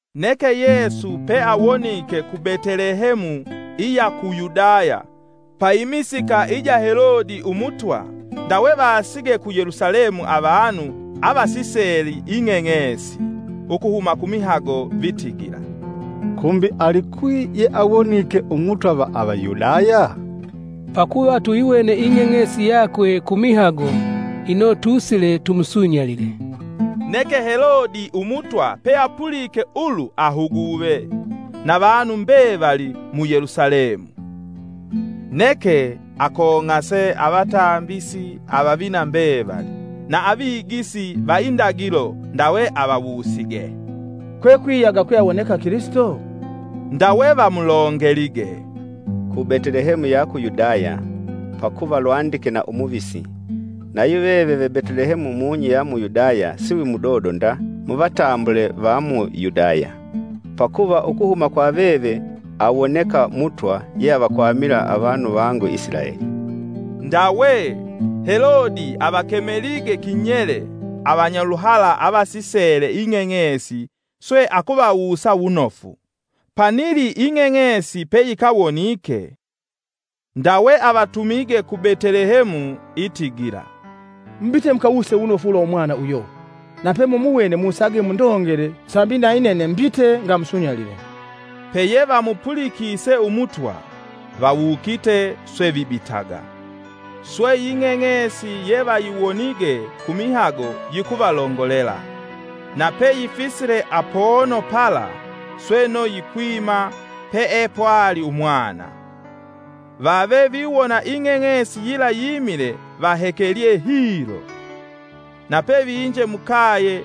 Neke Yesu pe awonike ku Betelehemu, iya ku Yudaya, pa imisika ija Helode Umutwa, ndawe vasige ku Yelusalemu avanu avasisele ing'eng'esi ukuhuma kumihago vitigila, “Kumbi alikwi yeawonike Umutwa va Avayudaya? Pakuva tuyiwene ing'eng'esi yakwe kumihago, ino tusile tumusunyalile.” Neke Helode umutwa peapulike ulu ahuguve, na vanu mbevali mu Yelusalemu. Neke, akong'ase avatambisi avavina mbevali, na avigisi va indagilo, ndawe avawusige, “Kwekwiyaga kwe awoneka Kilisito?” Ndawe vamulongelige, “ku Betelehemu ya ku Yudaya; pakuva lwandike na umuvisi: ‘Nayuveve ve Betelehemu mung'i ya mu Yudaya, siwimudodo nda muvatambule va mu Yudaya; pakuva ukuhuma kwa veve awoneka Mutwa yeavakwamila avanu vangu Isilaeli.’” Ndawe, Helode avakemelige kinyele avanyaluhala avasisele ing'eng'esi swe akuvawusa wunofu, panili ing'eng'esi peyikawonike. Ndawe avatumige ku Betelehemu, itigila, “Mubite mukawuse wunofu ulwa umwana uyo. Nape mumuwene musage mundongele sambi nayinene mbite ngamusunyalile.” Peye vamupulikise umutwa, vawukite swe vibitaga. Swe Ing'eng'esi yevayiwonige kumihago yikuvalongolela, nape yifisile apono pala sweno yikwima peepwali Umwana. Vave viwona ing'eng'esi yila yimile vahekelye hilo. Nape vinje mukaye,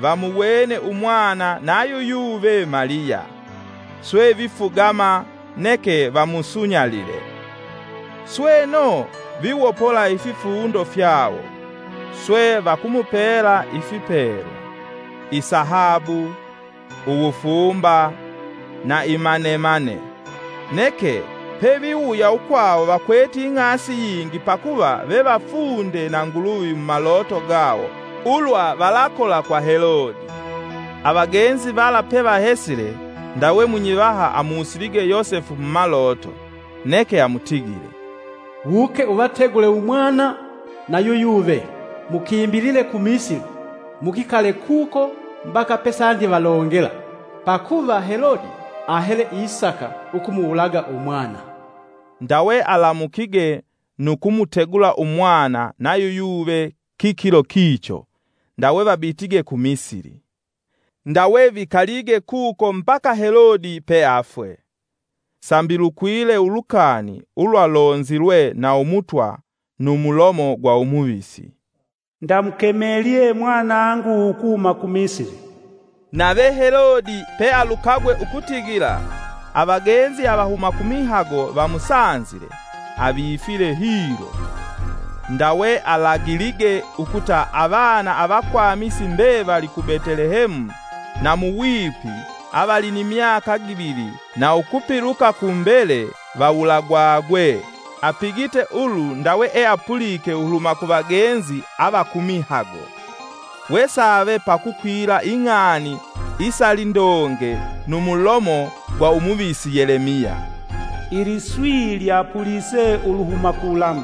vamuwene Umwana nayuyuve Maliya; swe vifugama, neke vamusunyalile. Sweno viwopola ififundo fyawo, swe vakumupela ifipelwa: isahabu, Uwufumba na imanemane. Neke peviwuya ukwawo vakwete ing'asi yingi pakuva vevafunde na Nguluvi mumaloto gawo ulwa valakola kwa Helode. Avagenzi vala pevahesile, ndawe munyivaha amusilige Yosefu mumaloto neke amutigile, “Wuke uvategule Umwana na yuyuve, mukimbilile ku Misili. Mukikale kuko mbaka pesandivalongela, pakuva Helode ahele isaka ukumuwulaga Umwana.” Ndawe alamukige nu kumutegula Umwana na yuyuve kikilo kicho, ndawe vabitige ku Misili. Ndawe vikalige kuko mbaka Helode pe afwe. Sambi lukwile ulukani ulwa lonzilwe na Umutwa nu mulomo gwa umuvisi: “Ndamukemelye mwanangu ukuhuma ku Misili.” Nave Helode pe alukagwe ukutigila avagenzi avahuma kumihago vamusanzile, avifile hilo. Ndawe alagilige ukuta avana avakwamisi mbevali ku Betelehemu na muwipi avali ni myaka givili na ukupiluka kumbele vawulagwagwe, apigite ulu ndawe eapulike uluhuma kuvagenzi avakumihago. Wesave pakukwila ing'ani isalindoge numulomo gwa umuvisi Yelemiya. “Iliswi lyapulise uluhuma ku Lama,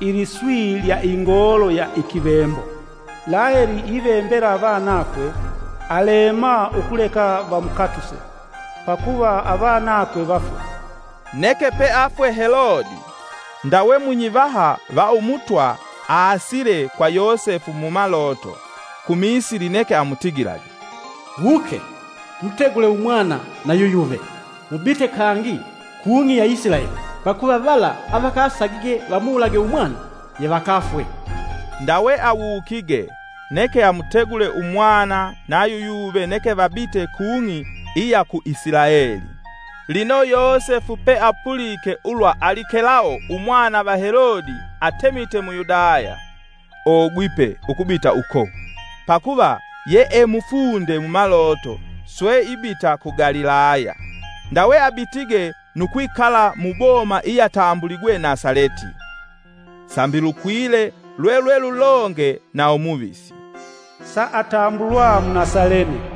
Iliswi lya ingoolo ya ikivembo. Laheli ivembela avanakwe; alema ukuleka vamukatuse, pakuva avanakwe vafwe.” Neke pe afwe Helode, ndawe munyivaha va Umutwa aasile kwa Yosefu mumaloto ku Misili neke amutigilage, “Wuke! Mutegule Umwana na yuyuve, mubite kangi kung'i ya Isilaeli, pakuva vala avakasakige vamuwulage umwana yevakafwe.” Ndawe awukige, neke amutegule umwana na yuyuve neke vabite kung'i iya ku Isilaeli. Lino Yosefu peapulike ulwa Alikelao umwana va Helode atemite mu Yudaya, ogwipe ukubita uko, pakuva ye e mufunde mumaloto, swe ibita ku Galilaya, ndawe abitige nu kwikala muboma iyatambuligwe Nasaleti. Sambi lukwile, lwelwelulonge na umuvisi, “Saatambulwa Munasalene.”